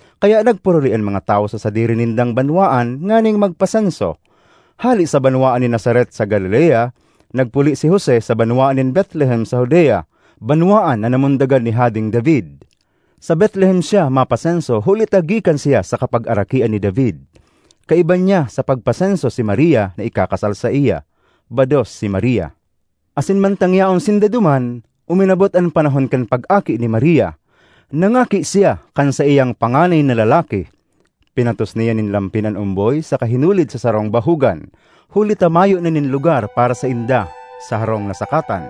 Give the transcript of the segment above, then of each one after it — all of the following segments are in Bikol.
Kaya nagpuruli an mga tawo sa sadiri nindang banwaan nganing magpasenso. Hale sa banwaan nin Nazaret sa Galilea, nagpuli si Jose sa banwaan nin Betlehem sa Judea, banwaan na namundagan ni Hadeng David. Sa Betlehem siya mapasenso huli ta gikan siya sa kapagarakian ni David. Kaiba niya sa pagpasenso si Maria na ikakasal saiya. Bados si Maria, asin mantang yaon sinda duman, uminabot an panahon kan pag-aki ni Maria. Nangaki siya kan saiyang panganay na lalaki. Pinatos niya nin lampin an omboy saka hinulid sa sarong bahugan, huli ta mayo na nin lugar para sainda sa harong na sakatan.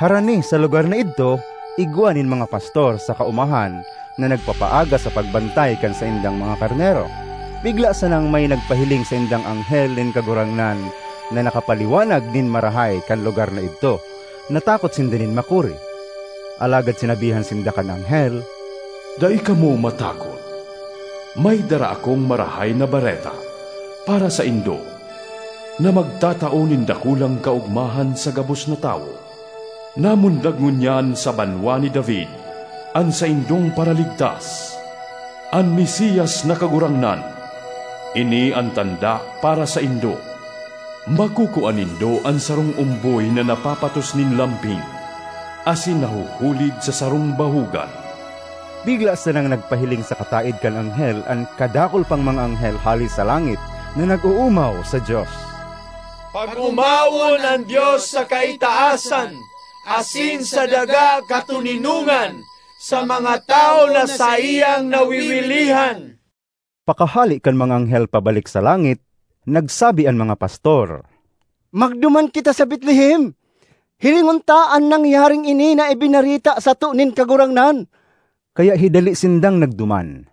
Harani sa lugar na idto, igwa nin mga pastor sa kaomahan na nagpapaaga sa pagbantay kan saindang mga karnero. Bigla sanang may nagpahiling saindang anghel nin Kagurangnan na nakapaliwanag nin marahay kan lugar na idto. Natakot sinda nin makuri. Alagad sinabihan sinda kan anghel, “Dai kamo matakot! May dara akong marahay na bareta para saindo na magtatao nin dakulang kaogmahan sa gabos na tawo. Namundag ngunyan sa banwa ni David an saindong Paraligtas—an Mesias na Kagurangnan! Ini an tanda para saindo: makukua nindo an sarong omboy na napapatos nin lampin asin nahuhulid sa sarong bahugan.” Bigla sanang nagpahiling sa kataed kan anghel an kadakul pang mga anghel hale sa langit, na nag-oomaw sa Dios, ”Pag-omawon an Dios sa kaitaasan asin sa daga katoninongan sa mga tawo na saiyang nawiwilihan!” Pakahale kan mga anghel pabalik sa langit, nagsabi an mga pastor, “Magduman kita sa Betlehem! Hilingon ta an nangyaring ini na ibinareta sato nin Kagurangnan.” Kaya hidali sindang nagduman.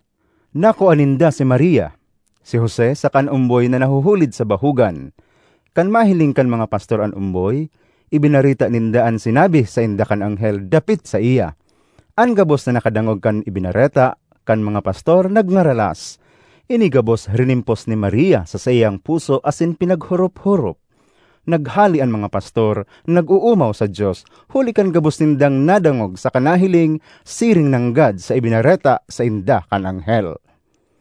Nakua ninda si Maria, si Jose saka an omboy na nahuhulid sa bahugan. Kan mahiling kan mga pastor an omboy, ibinareta ninda an sinabi sainda kan anghel dapit saiya. An gabos na nakadangog kan ibinareta kan mga pastor nagngaralas. Ini gabos rinimpos ni Maria sa saiyang puso asin pinaghorop-horop. Naghale an mga pastor, nag-oomaw sa Dios huli kan gabos nindang nadangog saka nahiling siring nanggad sa ibinareta sainda kan anghel.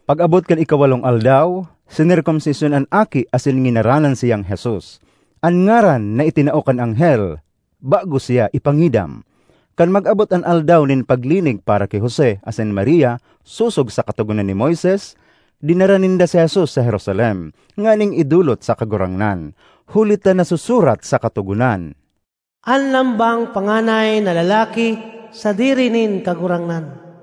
Pag-abot kan ikawalong aldaw, sinerkomsisyon an aki asin nginaranan siyang Jesus, an ngaran na itinao kan anghel bago siya ipangidam. Kan mag-abot an aldaw nin paglinig para ki Jose asin Maria sosog sa Katogonan ni Moises, dinara ninda si Jesus sa Jerusalem nganing idolot sa Kagurangnan, huli ta nasusurat sa Katogonan: “An lambang panganay na lalaki sadiri nin Kagurangnan.”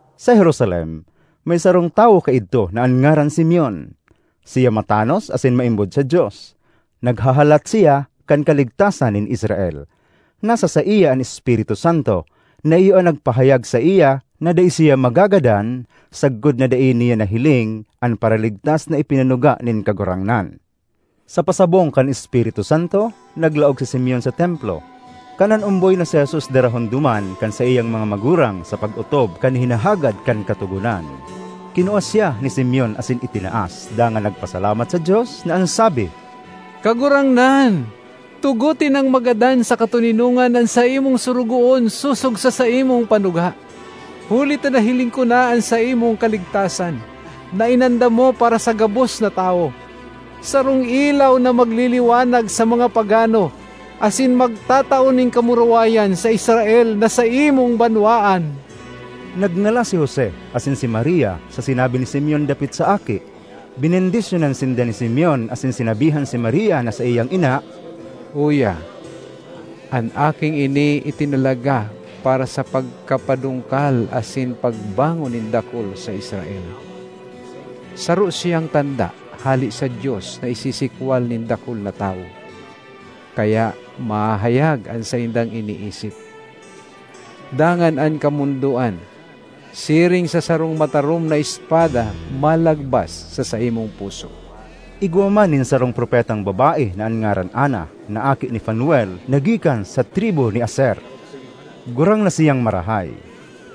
Sa Jerusalem may sarong tawo kaidto na an ngaran Simeon. Siya matanos asin maimbod sa Dios; naghahalat siya kan kaligtasan nin Israel. Nasa saiya an Espiritu Santo, na iyo an nagpahayag saiya na dai siya magagadan sagkod na dai niya nahiling an Paraligtas na ipinanuga nin Kagurangnan. Sa pasabong kan Espiritu Santo, naglaog si Simeon sa Templo. Kan an omboy na si Jesus darahon duman kan saiyang mga magurang sa pag-otob kan hinahagad kan Katogonan, kinua siya ni Simeon asin itinaas, dangan nagpasalamat sa Dios na an sabi: ”Kagurangnan, tugote nang magadan sa katoninongan an saimong sorogoon sosog sa saimong panuga, huli ta nahiling ko na an saimong kaligtasan, na inandam mo para sa gabos na tawo: sarong ilaw na magliliwanag sa mga pagano, asin magtatao nin kamurawayan sa Israel na saimong banwaan.” Nagngalas si Jose asin si Maria sa sinabi ni Simeon dapit sa aki. Benendisyonan sinda ni Simeon, asin sinabihan si Maria na saiyang ina, “Uya, an aking ini itinalaga para sa pagkapadungkal asin pagbangon nin dakul sa Israel; saro siyang tanda hale sa Dios na isisikwal nin dakul na tawo, kaya mahahayag an saindang iniisip. Dangan an kamondoan, siring sa sarong matarom na espada, malagbas sa saimong puso.” Igwa man nin sarong propetang babae na an ngaran Ana, na aki ni Fanuel na gikan sa tribu ni Aser. Gurang na siyang marahay.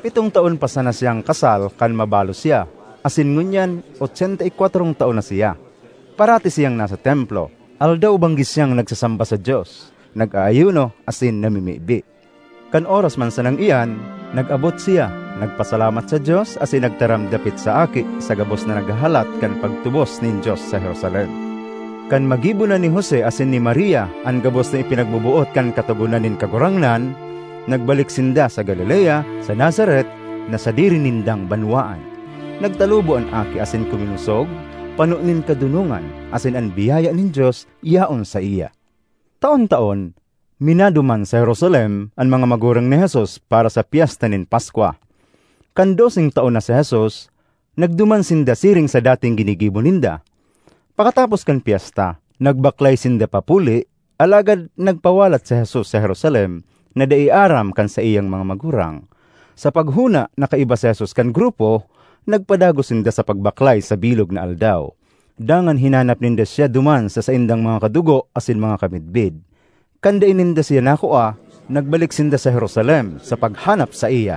Pitong taon pa sana siyang kasal kan mabalo siya, asin ngunyan otsenta y kwatrong taon na siya. Parati siyang nasa Templo; aldaw-banggi siyang nagsasamba sa Dios, nag-aayuno asin namimibi. Kan oras man sanang iyan, nag-abot siya, nagpasalamat sa Dios asin nagtaram dapit sa aki sa gabos na naghahalat kan pagtubos nin Dios sa Jerusalem. Kan magibo na ni Jose asin ni Maria an gabos na ipinagboboot kan Katogonan nin Kagurangnan, nagbalik sinda sa Galilea, sa Nazaret na sadiri nindang banwaan. Nagtalubo an aki asin kuminosog, pano nin kadonongan; asin an biyaya nin Dios yaon saiya. Taon-taon, minaduman sa Jerusalem an mga magurang ni Jesus para sa Pyesta nin Paskwa. Kan doseng taon na si Jesus, nagduman sinda siring sa dating ginigibo ninda. Pakatapos kan pyesta, nagbaklay sinda papuli, alagad nagpawalat si Jesus sa Jerusalem na dai aram kan saiyang mga magurang. Sa paghona na kaiba si Jesus kan grupo, nagpadagos sinda sa pagbaklay sa bilog na aldaw. Dangan hinanap ninda siya duman sa saindang mga kadugo asin mga kamidbid. Kan dai ninda siya nakua, nagbalik sinda sa Jerusalem sa paghanap saiya.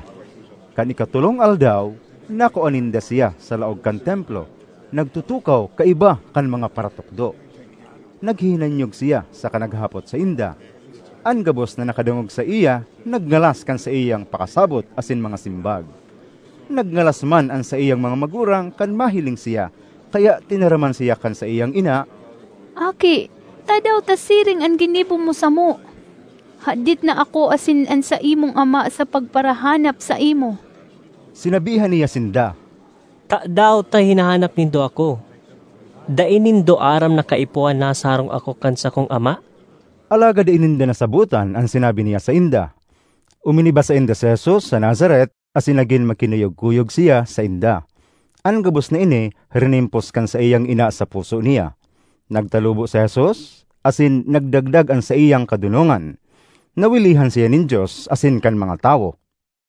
Kan ikatolong aldaw, nakua ninda siya sa laog kan Templo, nagtutukaw kaiba kan mga paratukdo. Naghihinanyog siya saka naghahapot sainda. An gabos na nakadangog saiya nagngalas kan saiyang pakasabot asin mga simbag. Nagngalas man an saiyang mga magurang kan mahiling siya, kaya tinaraman siya kan saiyang ina, “Aki, tadaw ta siring an ginibo mo samo? Hadit na ako asin an saimong ama sa pagparahanap saimo.” Sinabihan niya sinda, “Tadaw ta hinahanap nindo ako? Dai nindo aram na kaipuhan nasa harong ako kan sakong Ama?” Alagad dai ninda nasabotan an sinabi niya sainda. Uminiba sainda si Jesus sa Nazaret asin nagin makinuyog-kuyog siya sainda. An gabos na ini rinimpos kan saiyang ina sa puso niya. Nagtalubo si Jesus asin nagdagdag an saiyang kadonongan. Nawilihan siya nin Dios asin kan mga tawo.